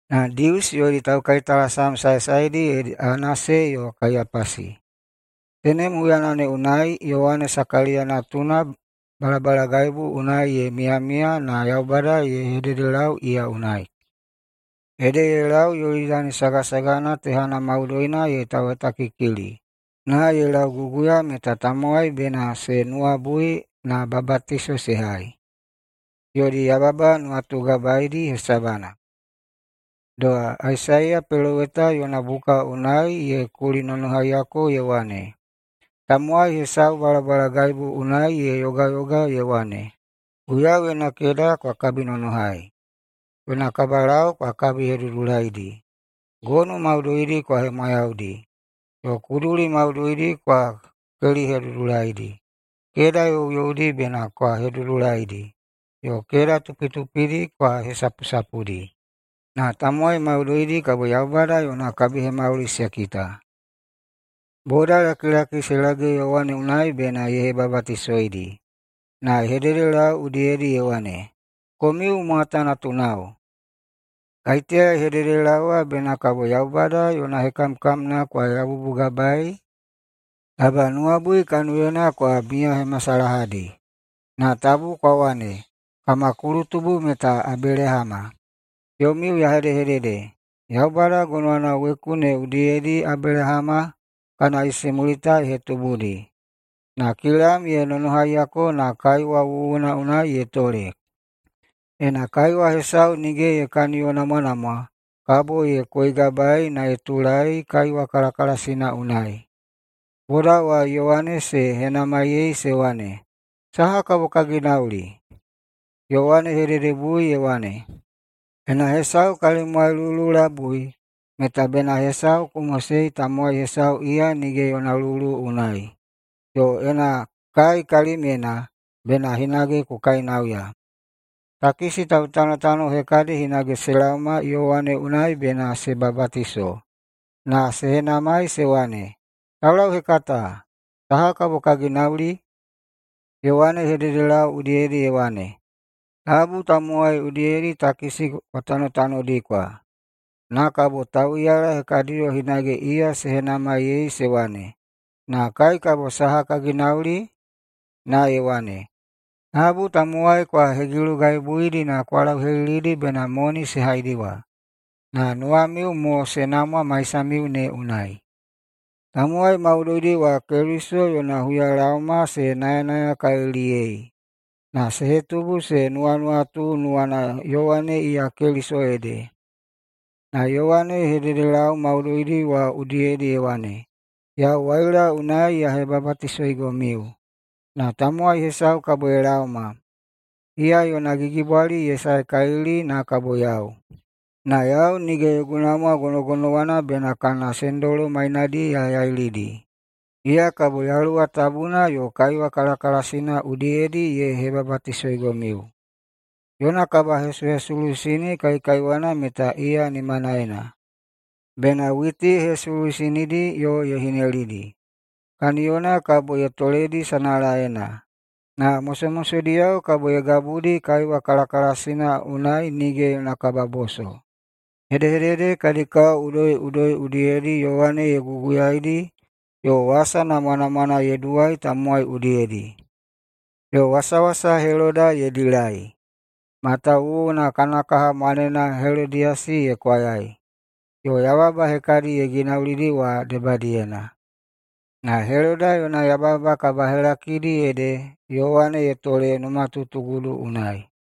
na Dius yodi taukaitalasam saesaedi ede Anase yo Kaiyapasi. Tenem huyana ne unai Yowane Sakaliya natuna balabalagaibu unai ye miyamiya na Yaubada ye hededelau iya unai. Ede ye lau Yolidani sagasagana tehana maudoina ye tauhetakikili na ye lauguguya meta tamowai bena se nuwabui na babatiso se hai, yodi yababa nuwatugabaedi hesabana. Doha Aisaiya peloweta yona buka unai ye kulinonohaiyako ye wane, “Tamowai hesau balabalagaibu unai ye yogayoga ye wane, ‘Guiyau yona keda kwa kabinonohai! Yona kabalau kwa kabihedudulaidi. Gonu maudoidi kwa hemwayaudi, yo kuduli maudoidi kwa kelihedudulaidi. Keda youyoudi bena kwa hedudulaidi, yo keda tupitupidi kwa hesapusapudi. Na tamowai maudoidi kabo Yaubada yona kabihemauli se kita.’” Bodalakilaki se lage Yowane unai bena ye hebabatisoidi, na ye hededelau udiyedi ye wane, “Komiu mwata natunao! Kaiteya ye hededelaowa bena kabo Yaubada yona hekamkamna kwa yabubugabaei? Taba nuwabui kaniyona kwa miyahemasalahadi! Na tabu kwa wane, ‘Kama kulutubu meta Abelahama.’ Yomiu ya hedehedede: Yaubada gonowana weku ne udiyedi Abelahama kana isimulita ye hetubudi. Na kilam ye nonohaiyako na kaiwa wuwuna unai ye tole. Ena kaiwa hesau nige ye kaniyonamwanamwa kabo ye koigabaei na ye tulaei kaiwa kalakalasina unai.” Boda wa Yowane se henamaiyei se wane, “Saha kabo ka ginauli?” Yowane ye hededebui ye wane, “Ena hesau kalimwai lulu labui meta bena hesau ku mosei tamowai hesau iya nige yona lulu unai. Yo ena kai kalimyena bena hinage ku kainauya.” Takisi tautanotano hekadi hinage se laoma Yowane unai bena se babatiso. Na se henamai se wane, “Taulauhekata, saha kabo ka ginauli?” Yowane ye hededelau udiyedi ye wane, “Tabu tamowai udiyedi takisi kwa tanotanodikwa.” Na kabo tauꞌiyala hekadiyo hinage iya se henamaiyei se wane, “Na kai kabo saha ka ginauli?” Na ye wane, “Tabu tamowai kwa hegilugaibuidi na kwa lauhelilidi bena moni se haidiwa, na nuwamiu mo se namwa maisamiu ne unai.” Tamowai maudoidi wa Keliso yona huyalaoma se nayanayakaliliyei, na se hetubu se nuwanuwatu nuwana Yowane iya Keliso ede. Na Yowane ye hededelau maudoidi wa udiyedi ye wane, “Yau waila unai ya hebabatisoigomiu. Na tamowai hesau kabo ye laoma, iya yona gigibwali ye saekalili na kabo yau, na yau nige yogu namwa gonogonowana bena kana sendolo mainadi ya yailidi. Iya kabo Yaluwa Tabuna yo kaiwa kalakalasina udiyedi ye hebabatisoigomiu. Yona kabahesuhesuluisini kaikaiwana meta iya nimanaena, bena witi ye hesuluisinidi yo ye hinelidi. Kaniyona kabo ye toledi sanalaena, na mosomosodiyao kabo ye gabudi kaiwa kalakalasina unai nige yona kababoso.” Hedehedede kadi kao udoiꞌudoi udiyedi Yowane ye guguyaidi yo wasa namwanamwana ye duwai tamowai udiyedi. Yo wasawasa Heloda ye dilai, matawuwuna kana kaha mwanena Helodiyasi ye kwayai, yo yababa hekadi ye ginaulidi wa debadiyena. Na Heloda yona yababa kabahelakidi ede Yowane ye tole numatutugudu unai.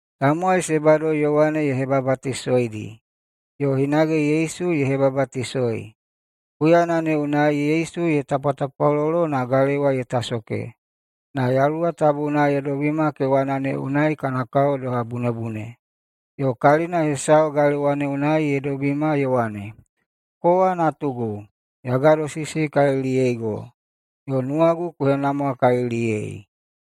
Tamowai se bado Yowane ye hebabatisoidi, yo hinage Yesu ye hebabatisoi. Huyana ne unai Yesu ye tapwatapwalolo na galewa ye tasoke na Yaluwa Tabuna ye dobima kewana ne unai kana kao doha bunebune, yo kalina hesau galewa ne unai ye dobima ye wane, “Kowa Natugu! Ya gadosisikaliliyeigo yo nuwagu ku henamwakaliliyei!”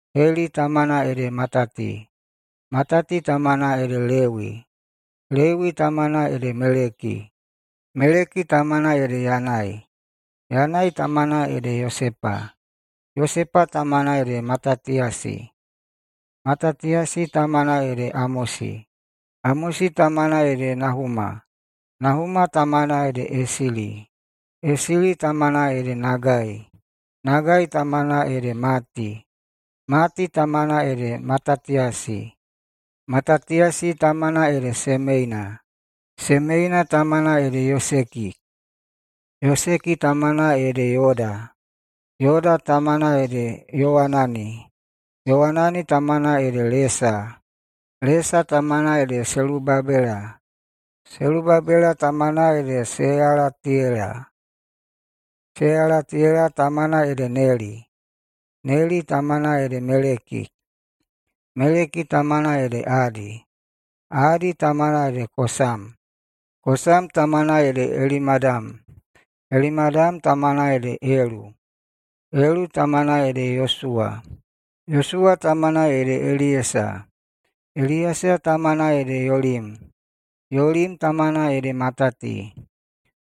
Heli tamana ede Matati, Matati tamana ede Lewi, Lewi tamana ede Meleki, Meleki tamana ede Yanai, Yanai tamana ede Yosepa, Yosepa tamana ede Matatiyasi, Matatiyasi tamana ede Amosi, Amosi tamana ede Nahuma, Nahuma tamana ede Esili, Esili tamana ede Nagai, Nagai tamana ede Mati, Mati tamana ede Matatiyasi, Matatiyasi tamana ede Semeina, Semeina tamana ede Yoseki, Yoseki tamana ede Yoda, Yoda tamana ede Yowanani, Yowanani tamana ede Lesa, Lesa tamana ede Selubabela, Selubabela tamana ede Seyalatiyela, Seyalatiyela tamana ede Neli, Neli tamana ede Meleki, Meleki tamana ede Adi, Adi tamana ede Kosam, Kosam tamana ede Elimadam, Elimadam tamana ede Elu, Elu tamana ede Yosuwa, Yosuwa tamana ede Eliyesa, Eliyesa tamana ede Yolim, Yolim tamana ede Matati,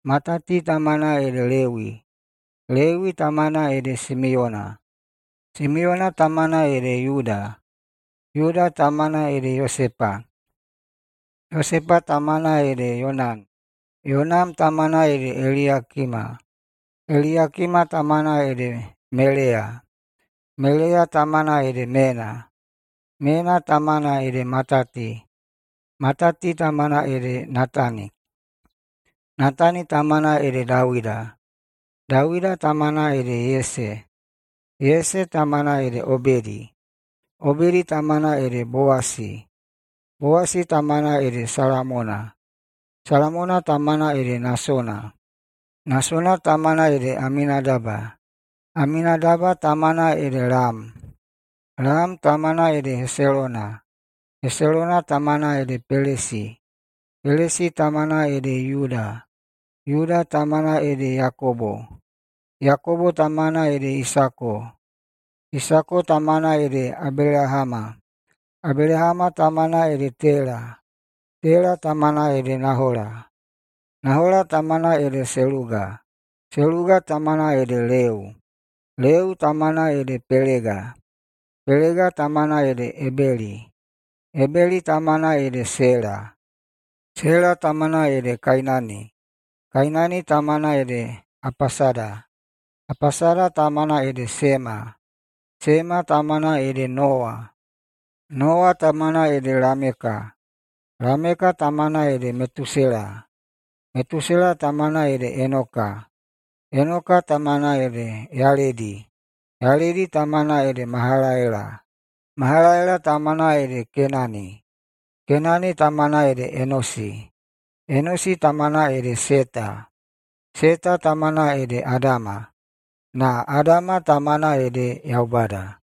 Matati tamana ede Lewi, Lewi tamana ede Simiyona, Simiyona tamana ede Yuda, Yuda tamana ede Yosepa, Yosepa tamana ede Yonam, Yonam tamana ede Eliyakima, Eliyakima tamana ede Meleya, Meleya tamana ede Mena, Mena tamana ede Matati, Matati tamana ede Natani, Natani tamana ede Dawida, Dawida tamana ede Yese, Yese tamana ede Obedi, Obedi tamana ede Bowasi, Bowasi tamana ede Salamona, Salamona tamana ede Nasona, Nasona tamana ede Aminadaba, Aminadaba tamana ede Lam, Lam tamana ede Heselona, Heselona tamana ede Pelesi, Pelesi tamana ede Yuda, Yuda tamana ede Yakobo, Yakobo tamana ede Isako, Isako tamana ede Abelahama, Abelahama tamana ede Tela, Tela tamana ede Nahola, Nahola tamana ede Seluga, Seluga tamana ede Leu, Leu tamana ede Pelega, Pelega tamana ede Ebeli, Ebeli tamana ede Sela, Sela tamana ede Kainani, Kainani tamana ede Apasada, Apasada tamana ede Sema, Sema tamana ede Nowa, Nowa tamana ede Lameka, Lameka tamana ede Metusela, Metusela tamana ede Enoka, Enoka tamana ede Yaledi, Yaledi tamana ede Mahalalela, Mahalalela tamana ede Kenani, Kenani tamana ede Enosi, Enosi tamana ede Seta, Seta tamana ede Adama, na Adama tamana ede Yaubada.